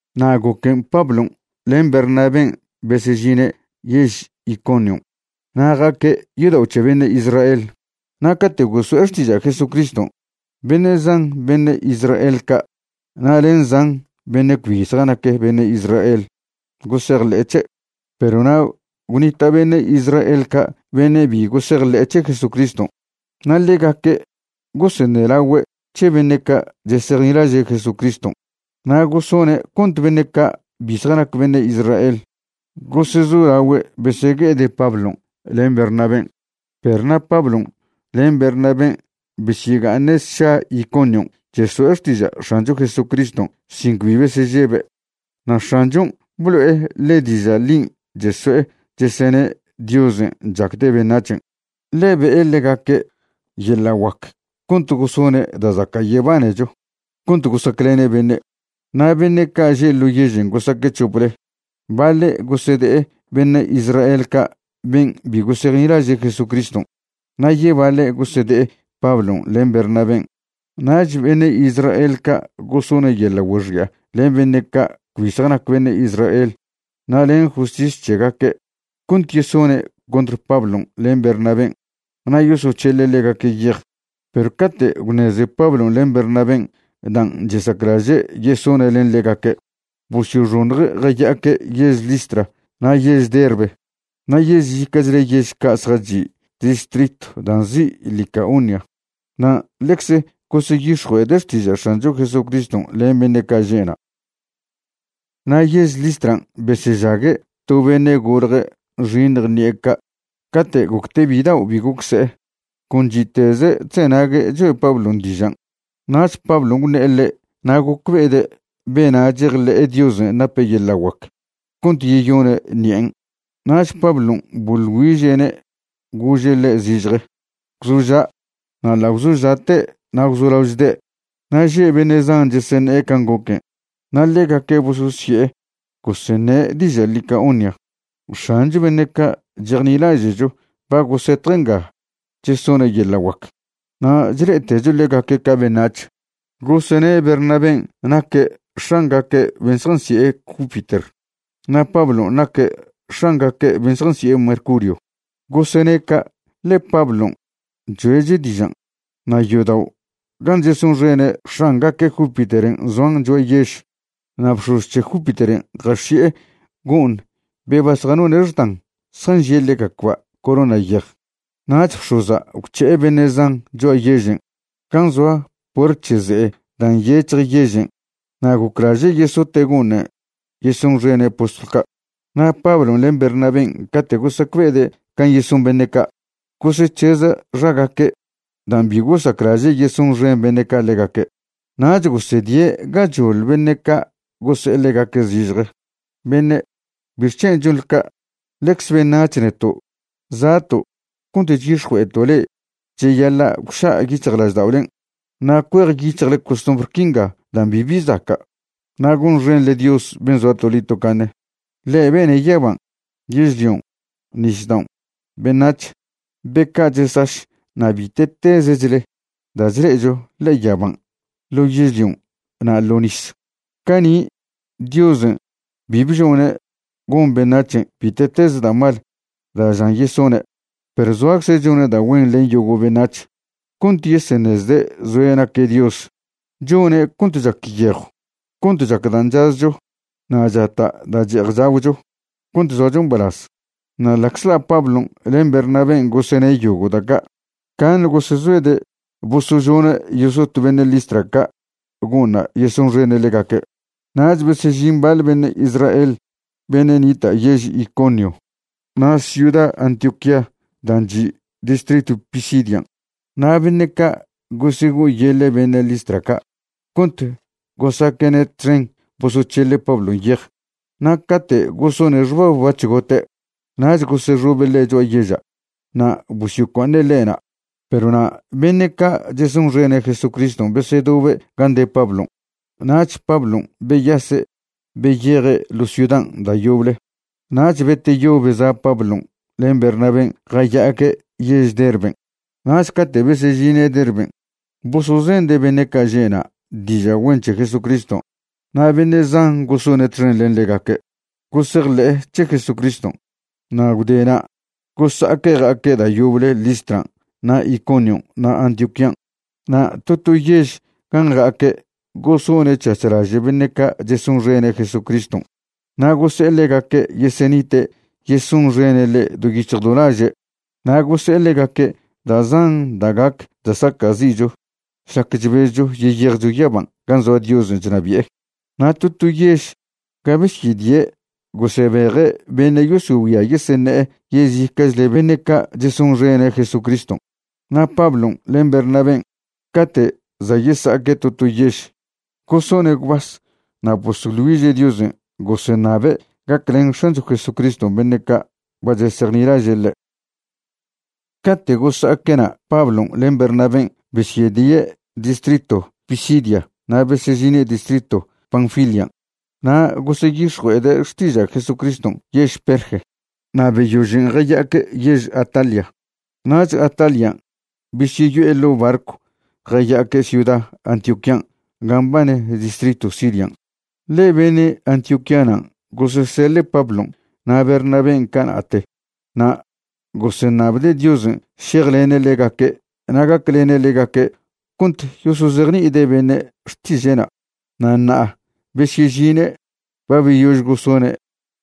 Na' goquen' Pablon' len Bernabén' besežine' yež Iconion' na' ja'aque' yodao' c̱he beṉe' Israel. Na' cate' goso'e xtiža' Jesucriston', beṉe' zan beṉe' Israel ca' na' len zan beṉe' cbi zjanac beṉe' Israel gosejḻe'e c̱he'. Perw na' gwnita' beṉe' Israel ca' beṉe' bi gosejḻe'e c̱he Jesucriston', na' ḻegaque' goseṉelagüe' c̱he beṉe' ca' chesejnilaže' Jesucriston' na' gosone' cont beṉe' ca' bi zjanac beṉe' Israel gosezolagüe' besegue'ede' Pablon' len Bernabén'. Perw na' Pablon' len Bernabén' besyega'aṉe' sša Iconion' cheso'e xtiža' X̱ancho Jesucriston' sin cbi besežebe'. Na' X̱anchon' blo'e ḻe diža' ḻin' cheso'e chesene' Diosen' chacde' beṉac̱hen', ḻe be'e ḻegaque' yeḻa' guac cont gosone' da' zaca' yebanecho cont gosaclene' beṉe'. Na' beṉe' ca' že' ḻo yežen' gosaque' c̱hople, baḻe' gosede'e beṉe' Israel ca' ben' bi gosejnilaže' Jesucriston' na' yebaḻe' gosede'e Pablon' len Bernabén'. Nach beṉe' Israel ca' gosone' yeḻa' güexi'a len beṉe' ca' cbi zjanac beṉe' Israel na' len justis c̱hegaque' cont yesone' contr Pablon' len Bernabén' na' yosoc̱hele' ḻegaque' yej. Perw cate' gwṉeze Pablon' len Bernabén' dan' chesaclaže' yesone' len ḻegaque', bosyoxoṉje' jaya'aque' yež Listra na' yež Derbe na' yezica'chle yež ca' zjachi' distritw dan' nzi' Licaonia. Na' ḻecz goseyix̱jue'ede' xtiža' X̱ancho Jesucriston' len beṉe' ca' že' na'. Na' yež Listran' besežague' to beṉe' golje' nxiṉj ṉi'e ca', cate' gocte' bidao' bi goc se'e. Con chi'teze' chzenague' choe' Pablon' dižan'. Nach Pablon' gwṉe'e ḻe' na' gocbe'ede' bena' chejḻe'e Diosen' nape' yeḻa' guac cont yeyone' ṉi'en'. Nach Pablon' boḻ güiže'ne' gože' ḻe' zižje: ―Gwzoža'. Na' ḻa' gwzoža'te' na' gwzolao chde'. Na' že' beṉe' zan cheseṉe'e can' goquen' na' ḻegaque' bososye'e goseṉe' diža' Licaonia: ―X̱ancho beṉe' ca' chejnilaže'cho ba gosetje' nga chesone' yeḻa' guac, na' chle'etecho ḻegaque' ca beṉac̱h. Gosene' Bernabén' naque' x̱angaque' ben' zjansi'e Júpiter, na' Pablon' naque' x̱angaque' ben' zjansi'e Mercurio. Gosene' ca' ḻe Pablon' choe'che' dižan'. Na' yodao' gan' chesonxene' x̱angaque' Júpiteren' zoan cho'a yež. Na' bx̱oz c̱he Júpiteren' jax̱i'e go'ṉ be ba zjanone' xdan zjanžie' ḻegacba' corona yej. Nach bx̱oza' gwc̱he'e beṉe' zan cho'a yežen' gan' zoa puert c̱he ze'e dan' nyec̱hj yežen' na' goclaže' yesote' go'ṉen' yesonxene' postlw ca'. Na' Pablon' len Bernabén' cate' gosacbe'ede' can' yeson beṉe' ca', gosec̱heza' xagaque' dan' bi gosaclaže' yesonxen beṉe' ca' ḻegaque'. Nach gosedie' gachoḻ beṉe' ca' gose'e ḻegaque' zižje: ―Beṉe', ¿bixchen' chonḻe ca'? Ḻecz beṉac̱h neto'. Za'to' cont chyix̱jue'eto' le'e cheyaḻa' gwša' yic̱hjlažda'olen' na' cuejyic̱hjle costumbr quinga dan' bibi zaca' na' gonxenḻe Dios ben' zoa toḻi tocaṉe. Ḻe' bene' yaban', yežlion', nisdaon', beṉac̱h, be ca' chesaš na' bite'tezechle da' chle'echo ḻe'e yaban', ḻo yežlion' na' ḻo' nis. Cani' Diosen' bi bžone' gon beṉac̱hen' bite'tez da' mal da' žan yesone'. Perw zoacze' chone' da' güen len yogo' beṉac̱h cont yeseṉezde' zoe' naque' Dios. Chone' cont chac yejw cont chac dan' chazcho na' chata' da' che'ej chagwcho cont zoacho mbalaz. Na' ḻa'czḻa' Pablon' len Bernabén' gosene' yogo' da' ca', caṉe gosezoede' bosožone' yesot beṉe' Listra ca' go'ṉna' yesonxene' ḻegaque'. Nach besežin baḻ beṉe' Israel beṉe' nita' yež Iconio na' ciuda Antioquía dan' chi' distritw Pisidian', na' beṉe' ca' gosego'oyeḻe' beṉe' Listra ca' cont gosaque'ne' txen bosoc̱hele' Pablon' yej. Na' cate' gosone' xbab bac̱h gote' nach gosexobe' ḻe' cho'a yeža' na' bosyocua'aṉe' ḻe' na'. Perw na' beṉe' ca' chesonxene' Jesucriston' besedobe' gan' de Pablon', nach Pablon' beyase' beyeje' ḻo ciudan' da' yoble. Nach beteyo beza' Pablon' len Bernabén' jaya'aque' yež Derben'. Nach cate' besežine' Derben' bosozende' beṉe' ca' že' na' diža' güen c̱he Jesucriston', na' beṉe' zan gosone' txen len ḻegaque' gosejḻe'e c̱he Jesucriston'. Na' gwdena' gosa'aque' ja'aque' da' yoble Listran' na' Iconion' na' Antioquían'. Na' to to yež gan' ja'aque' gosone' c̱hac̱h laže' beṉe' ca' chesonxene' Jesucriston' na' gose'e ḻegaque' yesenite' yesonxene' ḻe' do yic̱hj do laže', na' gose'e ḻegaque' da' zan da' gac da' saca'zi'cho šlac chbezcho yeyejcho yaban' gan' zoa Diosen' chnabi'e. Na' to to yež ga besyedie' gosebeje' beṉe' yosogüia yeseṉe'e yezica'chle beṉe' ca' chesonxene' Jesucriston'. Na' Pablon' len Bernabén', cate' za' yesa'aque' to to yež, gosone' gwbas na' bosoḻ güiže' Diosen' goseṉabe' gaclen X̱ancho Jesucriston' beṉe' ca' ba chesejnilaže' ḻe'. Cate' gosa'aque'na' Pablon' len Bernabén' besyedie' distritw Pisidia na' besežine' distritw Panfilian'. Na' goseyix̱jue'ede' xtiža' Jesucriston' yež Perge na' beyožen' jaya'aque' yež Atalia. Nach Atalian' besyeyo'e ḻo' barcw jaya'aque' ciuda Antioquían' gan' mbane distritw Sirian'. Ḻe beṉe' Antioquíanan' goseseḻe' Pablon' na' Bernabén' cana'te na' goseṉabde' Diosen' šejlene' ḻegaque' na' gaclene' ḻegaque' cont yosozejni'ide' beṉe' xtiže'na'. Na' ṉa'a besyežine' ba beyož gosone'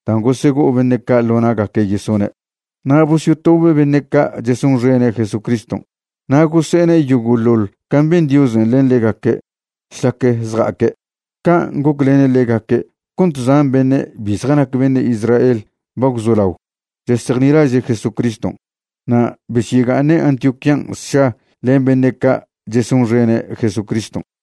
dan' gosego'o beṉe' ca' ḻo na'gaque' yesone'. Na' bosyotobe' beṉe' ca' chesonxene' Jesucriston' na' gose'ene' yogo'ḻoḻ can' ben Diosen' len ḻegaque' šlac zja'aque', can' goclene' ḻegaque' cont zan beṉe' bi zjanac beṉe' Israel ba gwzolao chesejnilaže' Jesucriston'. Na' besyega'aṉe' Antioquían' sša len beṉe' ca' chesonxene' Jesucriston'.